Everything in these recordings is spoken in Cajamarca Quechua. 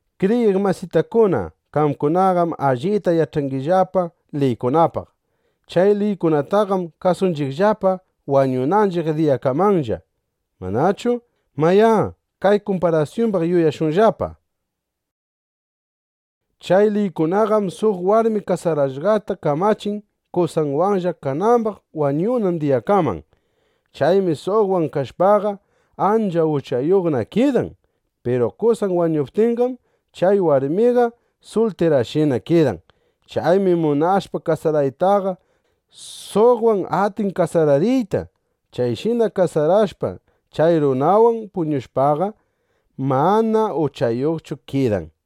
Kriyiq masitakuna, qamkunaqam allita yach'angillapa liykunapaq. Chay liykunataqam kasunchiqllapa wañunanchiq diyakamanlla, ¿manachu? Mayá, kay kumparasyumbaq yuyashunllapa: Chay liykunaqam suq warmi kasarashqata kamachin, qosanwanlla kanambaq wañunan diyakaman. Chaymi suqwan kashpaqa, ancha uchayuqna kidan. Piru qosan wañuptinqam, chay warmiqa sultirashinana kidan. Chaymi munashpa kasaraytaqa, suqwan atin kasarariyta. Chayshina kasarashpa, chay runanwan puñushpaqa, mana uchayuqchu kidan.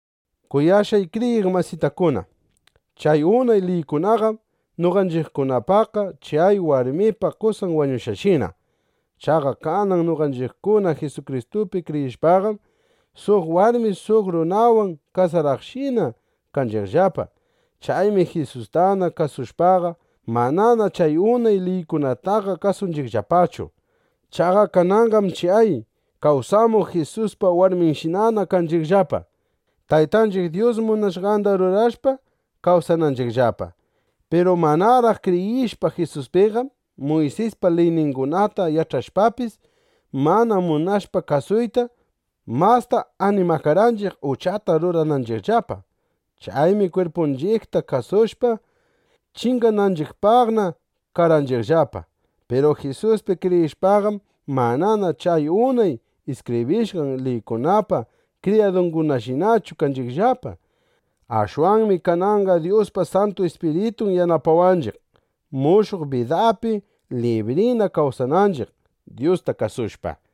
Kuyashqay kriyiq masitakuna, chay unay liykunaqam noqanchiqkunapaqqa chay warmipa qosan wañushqanshina. Chaqa kanan noqanchiqkuna Jisukristupi kriyishpaqam, suq warmi suq runawan kasaraqshina kanchiqllapa. Chaymi Jisustana kasushpaqa, manana chay unay liykunataqa kasunchiqllapachu. Chaqa kananqam chay kawsamuq Jisuspa warminshinana kanchiqllapa, Taytanchiq Dyus munashqanda rurashpa kawsananchiqllapa. Piru manaraq kriyishpa Jisuspiqam, Muysispa liyningunata yach'ashpapis, mana munashpa kasuyta, masta animakarqanchiq uchata rurananchiqllapa. Chaymi kwirpunchiqta kasushpa, chingananchiqpaqna karqanchiqllapa. Piru Jisuspi kriyishpaqam, manana chay unay iskibrishqan liykunapa kriyadunshinachu kanchiqllapa. Ashwanmi kananqa Dyuspa Santu Ispiritun yanapawanchiq, mushuq bidapi librina kawsananchiq, Dyusta kasushpa.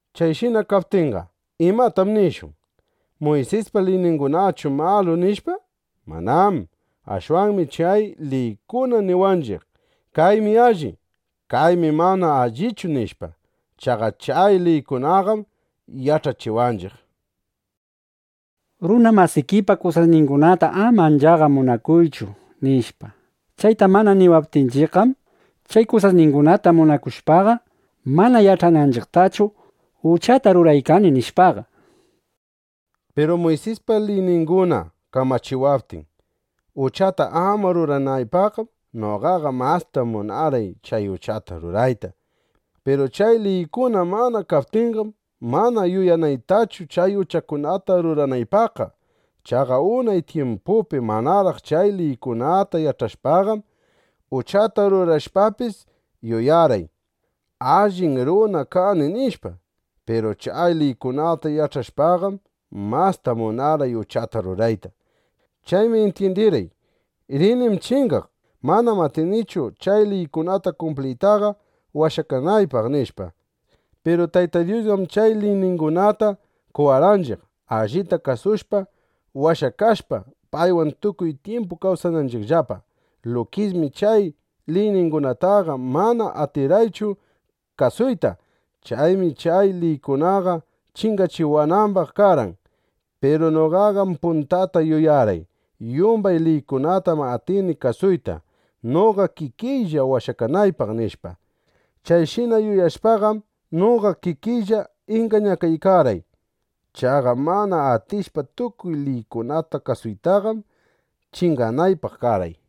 Chayshina kaptinqa, ¿imatam nishun? ¿Muysispa liyningunaqachu malu, nishpa? ¡Manám! Ashwanmi chay liykuna niwanchiq: Kaymi alli, kaymi mana allichu, nishpa. Chaqa chay liykunaqam yach'achiwanchiq: Runa masikipa kusasningunata ama anchaqa munakuychu, nishpa. Chayta mana niwaptinchiqqam, chay kusasningunata munakushpaqa, mana yach'ananchiqtachu: Uchatam ruraykani, nishpaqa. Piru Muysispa liyninguna kamachiwaptin, uchata ama ruranaypaqqam, noqaqa masta munarqay chay uchata rurayta. Piru chay liykuna mana kaptinqam, mana yuyanaytachu chay uchakunata ruranaypaqqa. Chaqa unay tyimpupi manaraq chay liykunata yach'ashpaqam, uchata rurashpapis, yuyarqay: Allin runam kani, nishpa. Piru chay liykunata yach'akushpaqam, masta munarqay uchata rurayta. Chaymi intyindirqay: Rinim chingaq. Manam atinichu chay liykunata kumpliytaqa washakanaypaq, nishpa. Piru Tayta Dyusqam chay liyningunata qowarqanchiq, allita kasushpa, washakashpa, paywan tukuy tyimpu kawsananchiqllapa. Lukismi chay liyningunataqa mana atirqaychu kasuyta. Chaymi chay liykunaqa chingachiwanambaq karqan. Piru noqaqam puntata yuyarqay: Yumbay liykunatam atini kasuyta, noqa kikiylla washakanaypaq, nishpa. Chayshina yuyashpaqam, noqa kikiylla ingañakaykarqay. Chaqa mana atishpa tukuy liykunata kasuytaqam, chinganaypaq karqay.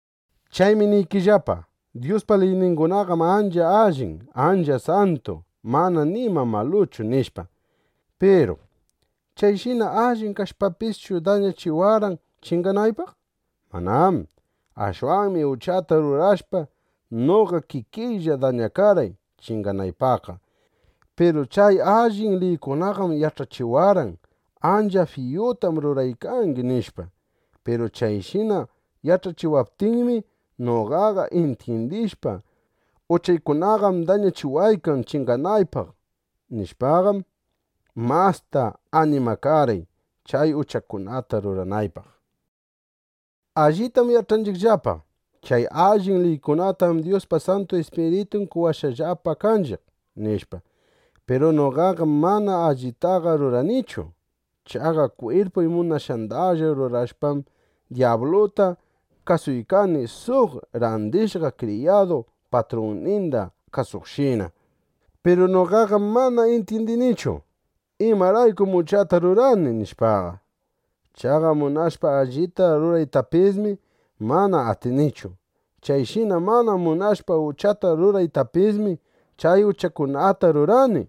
Chaymi niykillapa: Dyuspa liyningunaqam ancha allin, ancha santu, mana nima maluchu, nishpa. Piru ¿chayshina allin kashpapischu, dañachiwarqan chinganaypaq? ¡Manám! Ashwanmi uchata rurashpa, noqa kikiylla dañakarqay chinganaypaqqa. Piru chay allin liykunaqam yach'achiwarqan: Ancha fiyutam ruraykangi, nishpa. Piru chayshina yach'achiwaptinmi, noqaqa intyindishpa: Uchaykunaqam dañachiwaykan chinganaypaq, nishpaqam, masta animakarqay, chay uchakunata ruranaypaq. Allitam yach'anchiqllapa: Chay allin liykunatam Dyuspa Santu Ispiritun qowashqallapa kanchiq, nishpa. Piru noqaqam mana allitaqa ruranichu. Chaqa kwirpuy munashqandalla rurashpam, dyabluta kasuykani suq randishqa kriyadu patrunninda kasuqshina. Piru noqaqam mana intyindinichu: ¿Imaraykum uchata rurani? nishpaqa. Chaqa munashpa allita ruraytapismi, mana atinichu. Chayshina mana munashpa uchata ruraytapismi, chay uchakunata rurani.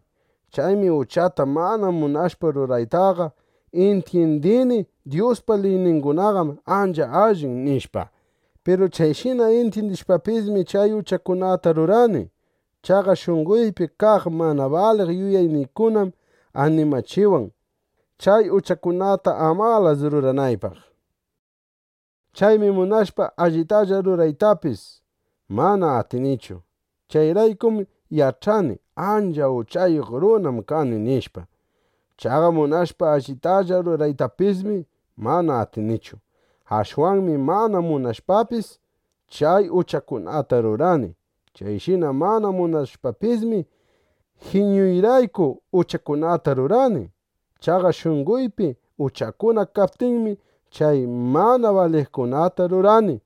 Chaymi uchata mana munashpa ruraytaqa, intyindini: Dyuspa liyningunaqam ancha allin, nishpa. Piru chayshina intyindishpapismi, chay uchakunata rurani. Chaqa shunqoypi kaq mana baliq yuyayniykunam animachiwan, chay uchakunata amalas ruranaypaq. Chaymi munashpa allitalla ruraytapis, mana atinichu. Chayraykum yach'ani: Ancha uchayuq runam kani, nishpa. Chaqa munashpa allitalla ruraytapismi, mana atinichu. Ashwanmi mana munashpapis, chay uchakunata rurani. Chayshina mana munashpapismi, jiñuyrayku uchakunata rurani. Chaqa shunqoypi uchakuna kaptinmi, chay mana baliqkunata rurani.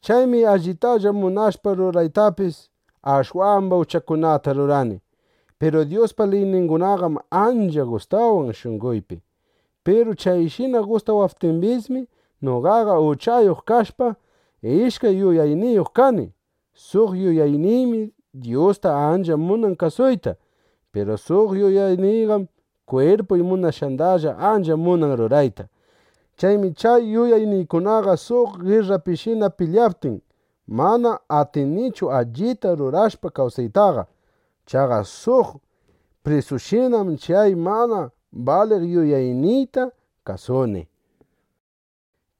Chaymi allitalla munashpa ruraytapis, ashwamba uchakunata rurani. Piru Dyuspa liyningunaqam ancha gustawan shunqoypi. Piru chayshina gustawaptimbismi, noqaqa uchayuq kashpa, ishkay yuyayniyuq kani. Suq yuyayniymi Dyusta ancha munan kasuyta. Piru suq yuyayniyqam kwirpuy munashqandalla ancha munan rurayta. Chaymi chay yuyayniykunaqa suq girrapishina pilyaptin, mana atinichu allita rurashpa kawsaytaqa. Chaqa suq prisushinam chay mana baliq yuyayniyta kasuni.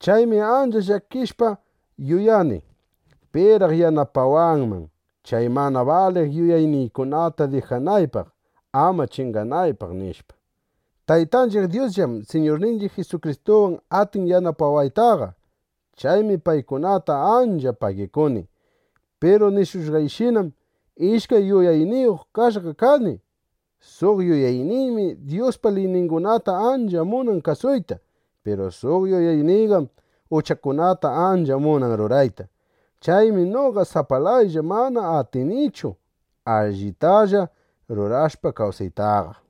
Chaymi ancha llakishpa yuyani: ¿Piraq yanapawanman, chay mana baliq yuyayniykunata dijanaypaq, ama chinganaypaq? nishpa. ¡Taytanchiq Dyusllam Siñurninchiq Jisukristuwan atin yanapawaytaqa! ¡Chaymi paykunata ancha pagikuni! Piru nishushqayshinam, ishkay yuyayniyuq kashqa kani. Suq yuyayniymi Dyuspa liyningunata ancha munan kasuyta. Piru suq yuyayniyqam uchakunata ancha munan rurayta. Chaymi noqa sapalayllaqa mana atinichu allitalla rurashpa kawsaytaqa.